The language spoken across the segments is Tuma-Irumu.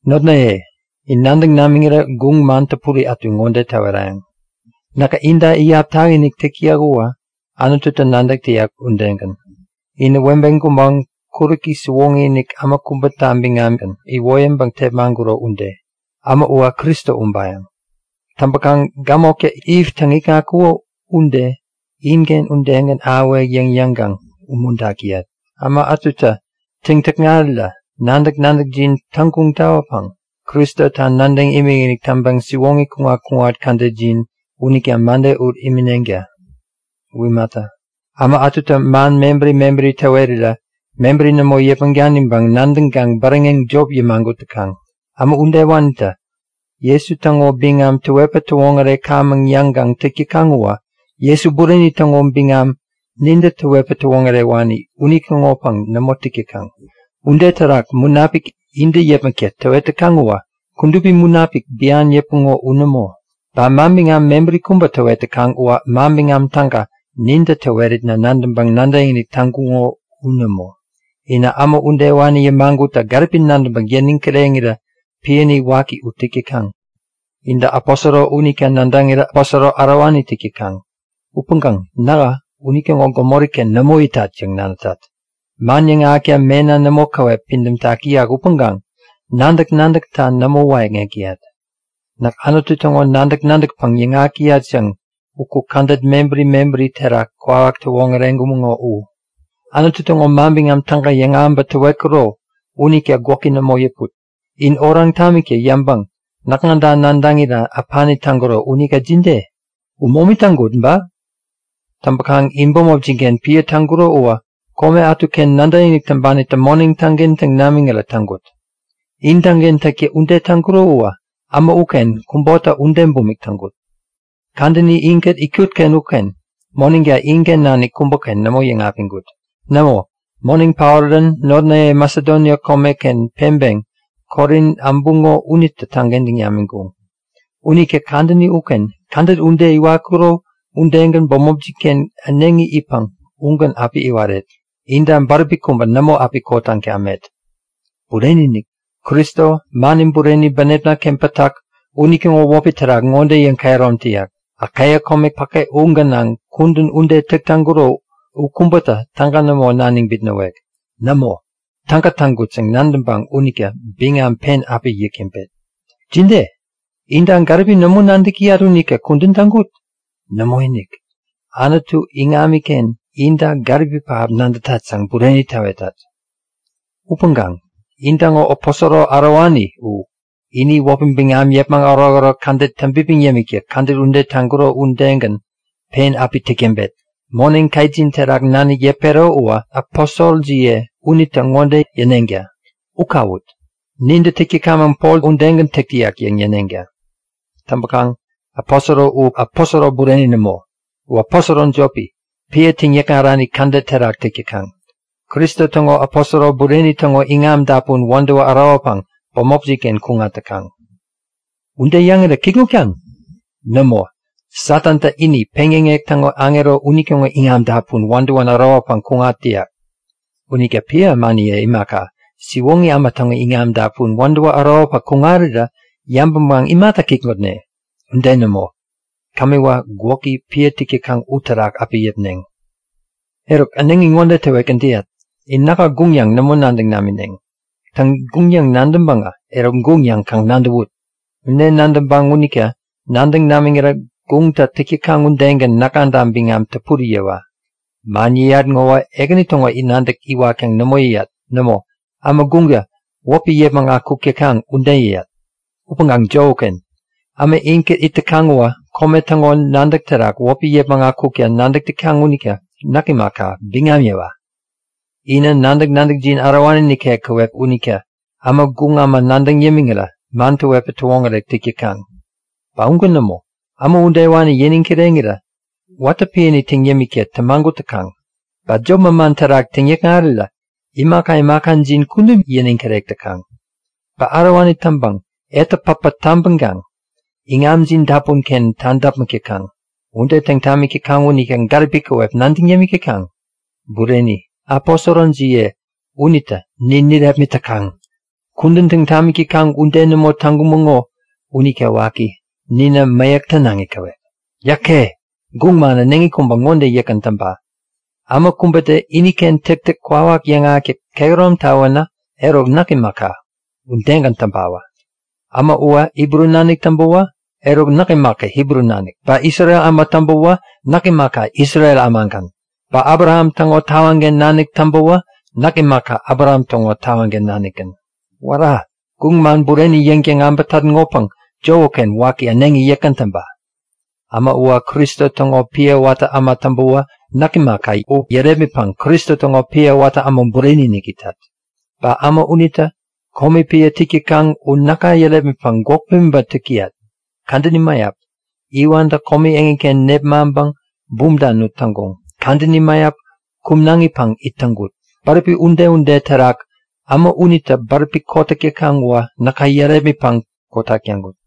Notnaye, in nadäŋ namiŋirä guŋ man täpuri ätu ŋode täwerayäŋ; Näkä inta iyap takinik täk täyat uwä Anututä nadäk täyak udegän. Inä webe gubaŋ kuräki siwoŋi-inik äma kubäta biŋamgän iwoyäŋpäŋ tepmaŋkuro ude. Äma uwä Kristo ubayäŋ. Täŋpäkaŋ gämoktä Iv täŋikŋatkuko ude inken udegän ahäwek yäŋ yäŋkaŋ umuntak täyat. Äma ätutä täŋ-täkŋarirä nadäk-nadäkjin täŋguŋ tawäpäŋ Kristota nadäŋ imikinik täŋpäŋ siwoŋi kuŋat-kuŋat kädetjin unita mäde ut imineŋta! U imata, äma ätutä man mebäri mebäri täwerirä mebäri nämo yäpmäŋ daniŋpäŋ nadäŋkaŋ bäräŋeŋ jop yämagut täkaŋ. Äma udewanitä Jesu täŋo biŋam täwetpäŋ täwoŋärekamäŋ yäŋkaŋ täk täkaŋ uwä Jesu bureni täŋo biŋam nintä täwetpäŋ täwoŋärewani unitäŋopäŋ nämo täk täkaŋ. Ude terak munapik intä yäpmäkta täwet täkaŋ uwä Kudupi Munapik bian yäpuŋo u nämo. Ba manbiŋam mebäri kubä täwet täkaŋ uwä Manbiŋam Täga nintä täweritna nadäŋpäŋ nadäkinik täŋkuŋo u nämo. Inä äma udewani yämagutta gäripi nadäŋpäŋ yäniŋ kireŋirä piäni waki u täk täkaŋ. Intä aposoro unita nadäŋirä aposoro ärowani täk täkaŋ. Upäŋkaŋ nähä unitäŋo gämori-ken nämo itat yäŋ nadätat! Man yäŋahäkta mena nämo käwep pidämtak täyak upäŋkaŋ nadäk-nadäkta nämo wäyäkŋek täyat. Näk Anutu täŋo nadäk-nadäkpäŋ yäŋahäk täyat yäŋ uku kädet mebäri mebäri terak kwawak täwoŋäreŋkumäŋo u. Anutu täŋo Manbiŋam Täga yäŋahäŋpäŋ täwetkuro unita gwäki nämo yäput. In oraŋ tamikta yäŋpäŋ näkŋata nadäŋira äpani täŋkuko unita jide? U momi täŋkut ba? Täŋpäkaŋ in bämopjin-ken piä täŋkuro uwä kome ätuken nadäkinik täŋpanitä moneŋ täŋkentäŋ namiŋirä täŋkut. In täŋkentäkta ude täŋkuro uwä äma uken kubota ude bumik täŋkut. Kadäni inkät itkut-ken uken moneŋta inken nanik kubäken nämo yäŋapiŋkut. Nämo, moneŋ paorirän notnaye Masedonia komeken peŋpeŋ Korin äbuŋo unitä täŋkentäŋ namiŋkuŋ. Unita kadäni uken kädet ude iwatkuro udegän bämopjin-ken äneŋi itpäŋ ugän api iwaret. Inta bäräpi kubä nämo api kotaŋ tamet. Bureni-inik! Kristo, mani bureni bänepna-ken pätak unitäŋo wäpi terak ŋode yäŋkehärom täyat; Akaia kome päke u gänaŋ kudän ude täk täŋkuro u kubätä täga nämo naniŋ bitnäwek. Nämo, täga täŋkut yäŋ nadäŋpäŋ unita biŋam pen api yäk täŋpet. Jide? Inta gäripi nämo nadäk täyat unita kudän u täŋkut? Nämoinik, Anutu iŋamiken inta gäripi pähap nadätat yäŋ bureni täwetat! Upäŋkaŋ intäŋo aposoro ärowani u ini wäpi biŋam yäpmäŋ ärokärok kädet täŋpipiŋ yämikta kädet ude täŋkuro udegän pen api täk täŋpet. Moneŋ ketjin terak nanik yäpero uwä aposorojiye unitä ŋode yäneŋta; U kawut! Nintä täk täkamäŋ Pol udegän täk täyak yäŋ yäneŋta! Täŋpäkaŋ aposoro u aposoro bureni nämo, u aposoro jopi, piä täŋyäkŋarani kädet terak täk täkaŋ. Kristo täŋo aposoro bureni täŋo iŋam dapun wädäwä ärowäpäŋ bämopjin-ken kuŋat täkaŋ. Ude yäŋira kikŋutkaŋ? Nämo! Satantä ini, peŋyäŋek täŋo aŋero unitäŋo iŋam dapun wädäwän ärowäpäŋ kuŋat täyak. Unita piä ämaniye imaka, siwoŋi äma täŋo iŋam dapun wädäwä ärowäpäŋ kuŋarirä yabäŋkaŋ imata kikŋutne? Ude nämo! Kämiwä gwäki, piä täk täkaŋ uterak api yäpneŋ! Eruk, äneŋi ŋode täwetgän täyat; In näka guŋ yäŋ nämo nadäŋ namineŋ. Täŋ, guŋ yäŋ nadäŋpäŋä, eruk guŋ yäŋ kaŋ nadäwut! Ude nadäŋpäŋ unita nadäŋ namiŋirä guŋtä täk täkaŋ udegän näkŋata biŋam täpuri yäwa! Man yäyat ŋowä Ekäni täŋo nadäk iwatkaŋ nämo yäyat. Nämo, äma guŋtä wäpi yäpmäŋ akuk täkaŋ ude yäyat. Upäŋkaŋ jop uken! Äma inkät it täkaŋ uwä kome täŋo nadäk terak wäpi yäpmäŋ akukta nadäk täkaŋ unita näk imaka, biŋam yäwa! Inä nadäk-nadäkjin ärowani nikek käwep unita äma guŋ äma nadäŋ yämiŋirä man täwetpäŋ täwoŋärek täk täkaŋ! Ba ugän nämo, äma udewani yäniŋ kireŋirä watä piäni täŋ yämikta tämagut täkaŋ. Ba jop manman terak täŋ-täkŋarirä imaka imakajin kudup yäniŋ kirek täkaŋ. Ba ärowani täŋpäŋ etä päpä tabäŋkaŋ iŋamjin dapun-ken tadäpmäk täkaŋ. Ude täŋ tamik täkaŋ unita gäripi käwep nadäŋ yämik täkaŋ? Bureni, aposorojiye unitä nin nirepmit täkaŋ! Kudän täŋ tamik täkaŋ ude nämo täŋkumäŋo unita waki, ninä mäyäk tänaŋi käwep! Yäke! Guŋ man äneŋi kubä ŋode yäkgän täŋpa; Äma kubätä iniken täktäk kwawak yäŋahäkta kehärom tawänä, eruk näk imaka, udegän täŋpawä! Äma uwä Hibru nanik täŋpäwä, eruk näk imaka Hibru nanik. Ba Isrel äma täŋpäwä, näk imaka Isrel ämagän. Ba Abraham täŋo tawaŋken nanik täŋpäwä, näk imaka Abraham täŋo tawaŋken nanikgän. Wära! Guŋ man bureni yäŋtäŋ äbätat ŋopäŋ jop uken waki äneŋi yäkgän täŋpa! Äma uwä Kristo täŋo piä watä äma täŋpäwä, näk imaka u yärepmitpäŋ Kristo täŋo piä watä äma bureni-inik itat. Ba äma unitä komi piä täk täkaŋ u näkä yärepmitpäŋ gwäk pimiŋpäŋ täk täyat. Kadäni mäyap iwantä komi eŋiken nepmaŋpäŋ bumta nut täŋkuŋ. Kadäni mäyap kumnaŋipäŋ it täŋkut. Bäräpi ude-ude terak äma unitä bäräpi kotak täkaŋ uwä näkä yärepmitpäŋ kotak täŋkut.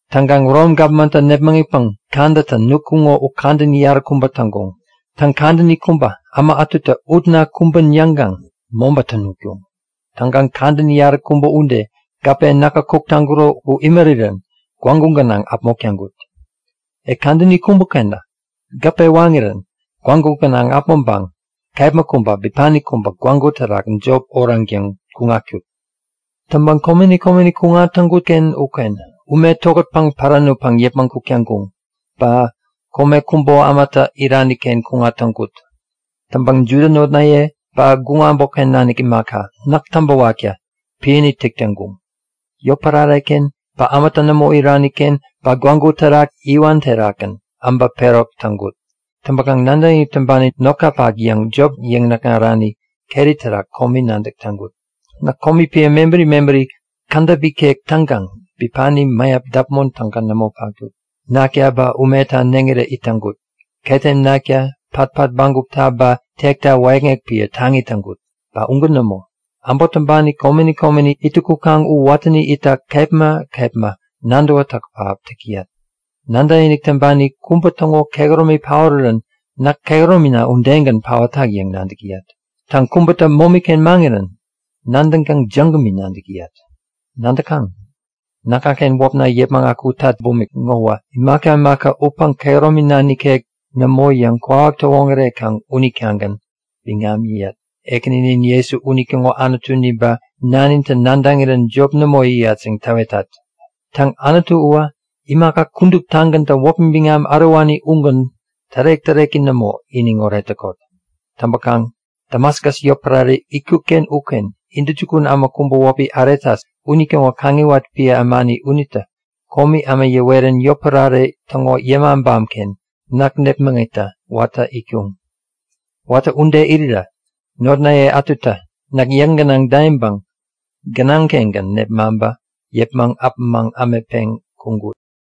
Täŋkaŋ Rom gapmantä nepmäŋitpäŋ kadätä nutkuŋo u kadäni yaräkubäta täŋkuŋ. Täŋ, kadäni kubä äma ätutä utna kumbän yäŋkaŋ mobätä nutkuŋ. Täŋkaŋ kadäni yaräkubä ude gäpe näkä kuk täŋkuro u imärirän gwägu gänaŋ äpmok täŋkut. E kadäni kubä-kenä gäpe waŋirän gwägu gänaŋ äpmoŋpäŋ kepma kubä, bipani kubä gwägu terak jop oraŋtäŋ kuŋatkut. Täŋpäŋ komeni komeni kuŋat täŋkut-ken uken ume tokätpäŋ pära nutpäŋ yäpmäŋ kuk täŋkuŋ, ba kome kubo ämatä irani-ken kuŋat täŋkut. Täŋpäŋ Juda notnaye ba guŋ äbotken nanik imaka, näk täŋpäwakta piäni täk täŋkuŋ. Yotpärare-ken ba ämatä nämo irani-ken ba gwägu terak iwan terakgän äbä perok täŋkut. Täŋpäkaŋ nadäkinik täŋpani notkapak yäŋ jop yäŋnäkŋarani keri terak komi nadäk täŋkut. Näk komi piä mebäri mebäri kädäp ikek täŋkaŋ bipani mäyap däpmon täga nämo patkut. Nakta ba umeta neŋirä it täŋkut. Ketem nakta, patpat bägupta ba tekta wäyäkŋek piä taŋi täŋkut. Ba ugän nämo, äbot täŋpani komeni komeni ittäŋ kukaŋ u watäni itta kepma kepma nadäwätäk pähap täk täyat. Nadäkinik täŋpani kubä täŋo kehäromi paorirän näk kehäromina udegän paotak yäŋ nadäk täyat. Täŋ, kubätä momi-ken maŋirän nadäŋkaŋ jägämi nadäk täyat. Nadäkaŋ, näkŋaken wäpna yäpmäŋ akutat bumik ŋowä imaka imaka upäŋ kehäromina nikek nämo yäŋ kwawak täwoŋärekaŋ unitagän biŋam yäyat. Ekäninin Jesu unitäŋo Anutuni ba Nanitä nadäŋirän jop nämo yäyat yäŋ täwetat! Täŋ, Anutu uwä, imaka kuduptagäntä wäpi biŋam ärowani ugän tärek-täreki nämo iniŋoret täkot! Täŋpäkaŋ Damaskus yotpärare itkut-ken uken intäjukun äma kubä wäpi Aretas unitäŋo kaŋiwat piä ämani unitä komi äma yäwerän yotpärare täŋo yämabam-ken näk nepmäŋitta watä itkuŋ. Watä ude irirä notnaye ätutä näk yäk gänaŋ daiŋpäŋ gänaŋ-kengän nepmaŋpä yäpmäŋ äpämaŋ ämetpeŋ kuŋkut.